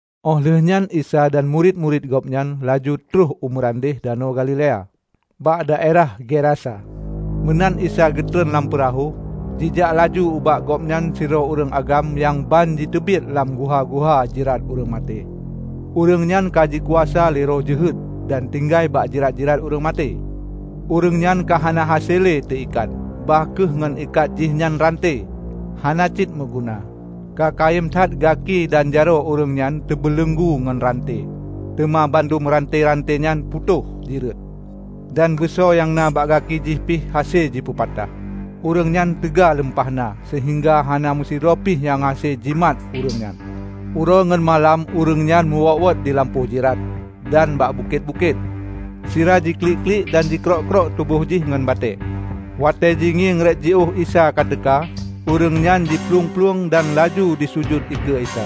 Óh lheueh nyan Isa dan murit-murit Gobnyan laju troh u meurandeh Danau Galilea, bak daerah Gerasa. Meunan Isa geutron lam peurahô, jijak laju ubak Gobnyan sidroe ureuëng agam nyang banjiteubiet lam guha-guha jirat ureuëng maté. Ureuëng nyan ka jikuasa lé roh jeuhet dan tinggai bak jirat-jirat ureuëng maté. Ureuëng nyan ka hana hase le teu ikat; bah kheueh ngon ikat jih nyan ranté, hana cit meuguna. Ka kayém that gaki dan jaroe ureuëng nyan teubeuleunggu ngon ranté, teuma bandum ranté-ranté nyan putôh jireut, dan beuso nyang na bak gaki jih pih hase jipeupatah. Ureuëng nyan teuga lumpah na seuhingga hana meusidroepi nyang hase jimat ureuëng nyan. Uroe ngon malam ureuëng nyan meuwot-wot dilampôh jirat dan bak bukét-bukét, sira jiklik-klik dan ji krôk-krôk tuboh jih ngon batée. Watée jingieng rot jiôh Isa ka teuka, ureuëng nyan jiplueng-plueng dan laju jisujut dikeue Isa.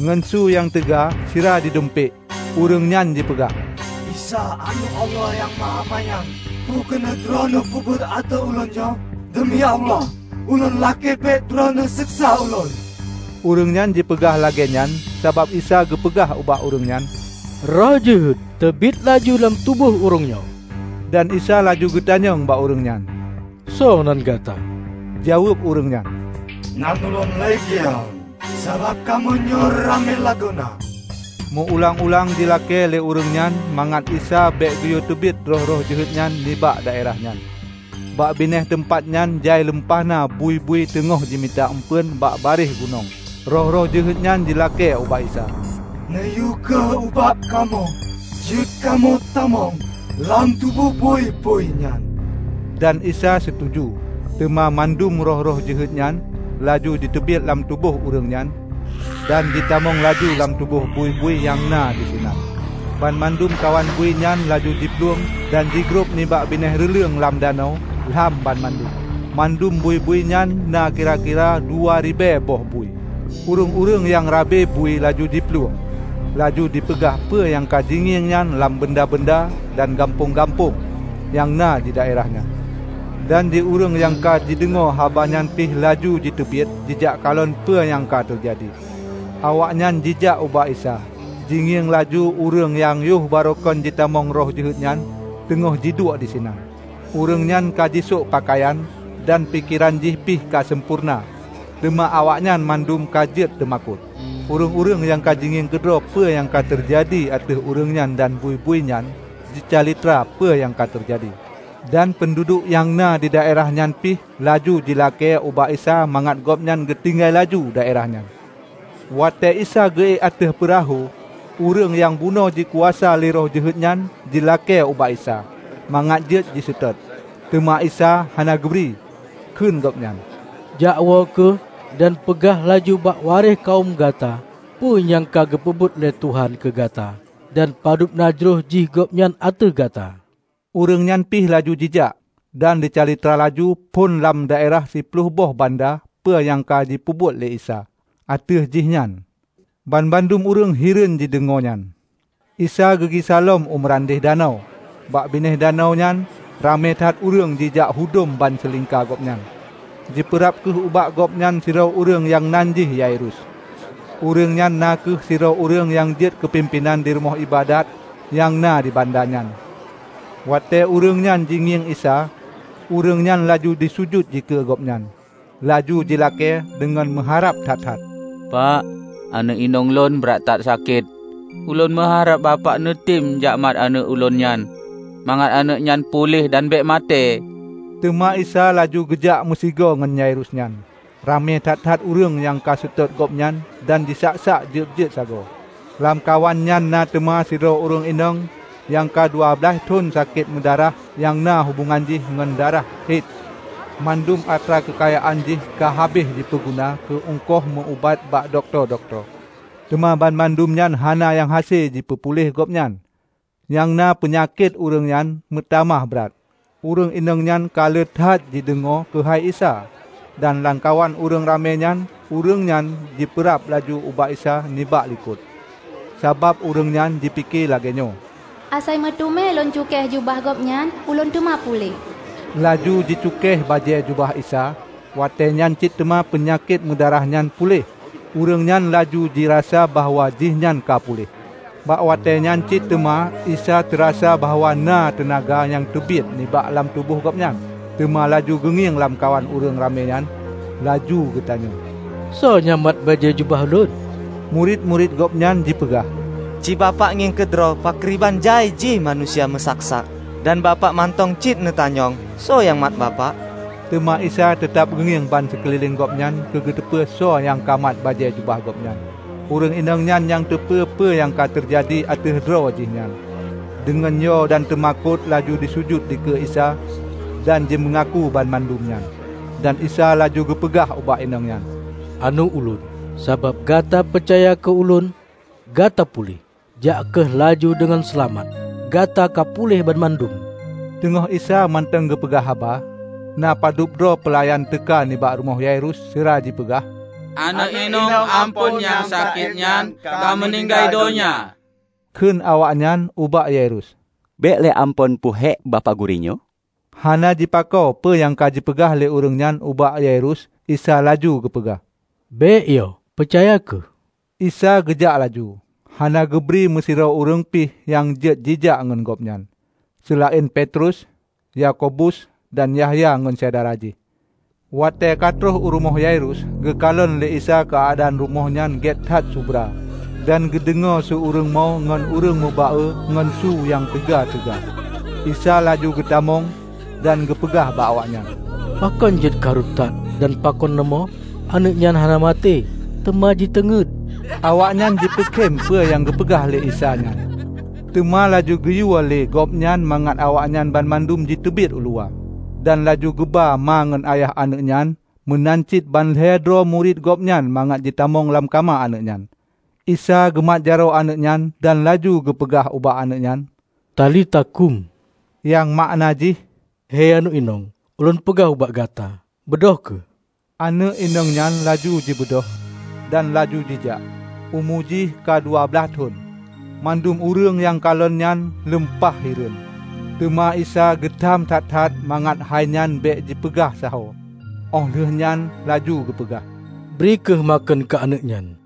Ngon su nyang teuga sira jidumpék ureuëng nyan jipeugah, "Isa. Aneuëk Allah Nyang Mahamanyang! Peue keuneuk Droeneueh peubuet ateueh ulôn nyoe? Deumi Allah, ulôn lakée bék Droeneueh seksa ulôn!" ( Ureuëng nyan jipeugah lagée nyan sabab Isa geupeugah ubak ureuëng nyan, "Roh jeuhet, teubiet laju lam tuboh ureuëng nyoe!") Dan Isa laju geutanyong bak ureuëng nyan, "Soe nan gata?" Jaweueb ureuëng nyan, "Nan ulôn 'Legiun' -- sabab kamoe nyoe ramé lagoena!" Meu-ulang-ulang jilakée lé ureuëng nyan mangat Isa bék geuyue teubiet roh-roh jeuhet nyan nibak daerah nyan. Bak binéh teumpat nyan jai lumpahna bui-bui nyang teungoh jimita eumpeuen bak barieh gunong. Roh-roh jeuhet nyan jilakée ubak Isa, "Neuyue kheueh ubak kamoe jeuet kamoe tamong lam tuboh bui-bui nyan." Dan Isa situju. Teuma mandum roh-roh jeuhet nyan laju jiteubiet lam tuboh ureuëng nyan dan jitamong laju lam tuboh bui-bui nyang na disinan. Banmandum kawan bui nyan laju jiplueng dan jigrob nibak binéh reuleueng lam danau -- lam banmandum, mandum bui-bui nyan na kira-kira dua ribée boh bui. Ureuëng-ureuëng nyang rabe bui laju jiplueng, laju jipeugah peue nyang ka jingieng nyan lam banda-banda dan gampông-gampông nyang na didaerah nyan. Dan di ureuëng nyang ka jideungoe habanyan pih laju jiteubiet jijak kalon peue nyang ka teujadi. Awaknyan jijak ubak Isa, jingieng laju ureuëng nyang yoh baroekan jitamong roh jeuhet nyan, teungoh jiduek disinan. Ureuëng nyan ka jisok peukayan, dan pikeran jih pih ka sampoereuna. Teuma awaknyan mandum ka jeuet teumakot. Ureuëng-ureuëng nyang ka jingieng keudroe peue nyang ka teujadi ateueh ureuëng nyan dan bui-bui nyan jicalitra peue nyang ka teujadi. Dan peunduduek nyang na didaerah nyan pih laju jilakée ubak Isa mangat Gobnyan geutinggai laju daerah nyan. Watée Isa geu-ék ateueh peurahô, ureuëng nyang bunoe jikuasa lé roh jeuhet nyan jilakée ubak Isa, mangat jeuet jiseutôt. Teuma lé Isa hana geubri, kheun Gobnyan, "Jakwoe kheueh dan peugah laju bak waréh kawöm gata peue nyang ka geupeubuet lé Tuhan keu gata dan padub na jroh jih Gobnyan ateueh gata!" Ureuëng nyan pih laju jijak, dan jicalitra laju phon lam daerah Siploh boh Banda peue nyang ka geupeubuet lé Isa ateueh jihnyan. Banmandum ureuëng hireuen jideungoe nyan. Isa geugisa lom u meurandeh danau. Bak binéh danau nyan, ramé that ureuëng jijak hudom bansilingka Gobnyan. Jipeurab kheueh ubak Gobnyan sidroe ureuëng nyang nan jih Yairus. Ureuëng nyan na kheueh sidroe ureuëng nyang jeuet keupimpénan rumoh iébadat nyang na di banda nyan. Watée ureuëng nyan jingieng Isa, ureuëng nyan laju jisujut dikeue Gobnyan, laju jilakée deungon meuharab that-that, "Pak, aneuëk inong lôn brat that sakét. Ulôn meuharab bapak neutem jakmat aneuëk ulôn nyan, mangat aneuëk nyan puléh dan bék maté!" Teuma Isa laju geujak meusigoe ngon Yairus nyan. Ramé that-that ureuëng nyang seutôt Gobnyan dan jisak-sak jeueb-jeueb sagoe. Lamkawan nyan na teuma sidroe ureuëng inong nyang ka dua blaih thon sakét meudarah nyang na hubongan jih ngon darah he. Mandum atra keukayaan jih ka habéh jipeuguna keu uengkoh meu-ubat bak dokto-dokto, teuma bandum nyan hana nyang hase jipeupuléh Gobnyan, nyang na peunyakét ureuëng nyan meutamah brat. Ureuëng inong nyan ka le that jideungoe keuhai Isa. Dan lamkawan ureuëng ramé nyan, ureuëng nyan jipeurab laju ubak Isa nibak likot, sabab ureuëng nyan jipike lagée nyoe, "Asai meuteumé lôn cukéh jubah Gobnyan, ulôn teuma puléh!" Laju jicukéh bajée jubah Isa, watée nyan cit teuma peunyakét meudarah nyan puléh. Ureuëng nyan laju jirasa bahwa jihnyan ka puléh. Bak watée nyan cit teuma Isa teurasa bahwa na teunaga nyang teubiet nibak lam tuboh Gobnyan. Teuma laju geungieng lamkawan ureuëng ramé nyan laju geutanyong, "Soe nyang mat bajée jubah Lôn?" Murit-murit Gobnyan jipeugah, "Ci Bapak ngieng keudroe pakriban jai jih manusia meusak-sak. Dan Bapak mantong cit neutanyong, soe nyang mat Bapak?" Teuma Isa teutab geungieng bansikeulileng Gobnyan keu geuteupeue soe nyang ka mat bajée jubah Gobnyan. Ureuëng inong nyan nyang teupeu peue nyang ka teujadi ateueh droe jihnyan, deungon yo dan teumakot laju jisujut dikeue Isa dan jimeungaku banmandum nyan. Dan Isa laju geupeugah ubak inong nyan, "Aneuëk Ulôn, sabab gata peucaya keu Ulôn, gata puléh! Jak kheueh laju deungon seulamat. Gata ka puléh banmandum!" Teungoh Isa mantong geupeugah haba, na padub droe peulayan teuka nibak rumoh Yairus sira jipeugah, "Aneuëk inong amphon nyang sakét nyan ka meuninggai donya," kheun awaknyan ubak Yairus. "Bék le Amphon peuhék Bapak Gurée nyoe." Hana jipakoe peue nyang ka jipeugah lé ureuëng nyan ubak Yairus Isa laju geupeugah, "Bék yo, peucaya kheueh!" Isa geujak laju, hana geubri meusidroe ureuëng pih nyang jeuet jijak ngon Gobnyan, seulaén Petrus, Yakobus dan Yahya ngon syedara jih. Watée ka troh u rumoh Yairus, geukalon lé Isa keuadaan rumoh nyan gét that subra, dan geudeungoe su ureuëng mo ngon ureuëng meuba-e ngon su nyang teuga-teuga. Isa laju geutamong dan geupeugah ubak awaknyan, "Pakon jeuet karu that dan pakon neumoe? Aneuëk nyan hana maté; teuma jiteungét!" Awaknyan jipeukém peue nyang geupeugah lé Isa nyan. Teuma laju geuyue lé gobnyan mangat awaknyan banmandum jiteubiet uluwa, dan laju geuba ma ngon ayah aneuëk nyan meunan cit ban lhée droe murit Gobnyan mangat jitamong lam kama aneuëk nyan. Isa geumat jaroe aneuëk nyan dan laju geupeugah ubak aneuëk nyan, "Talita kum," nyang makna jih, "Hei aneuëk inong, ulôn peugah ubak gata: Beudôh kheueh!" Aneuëk inong nyan laju jibeudôh, dan laju jijak (umu jih ka dua blaih thon.) Mandum ureuëng nyang kalon nyan lumpah hireuen! Teuma Isa geutam that-that mangat hai nyan bék jipeugah sahoe. Óh lheueh nyan laju geupeugah, "Bri kheueh makheun keu aneuëk nyan."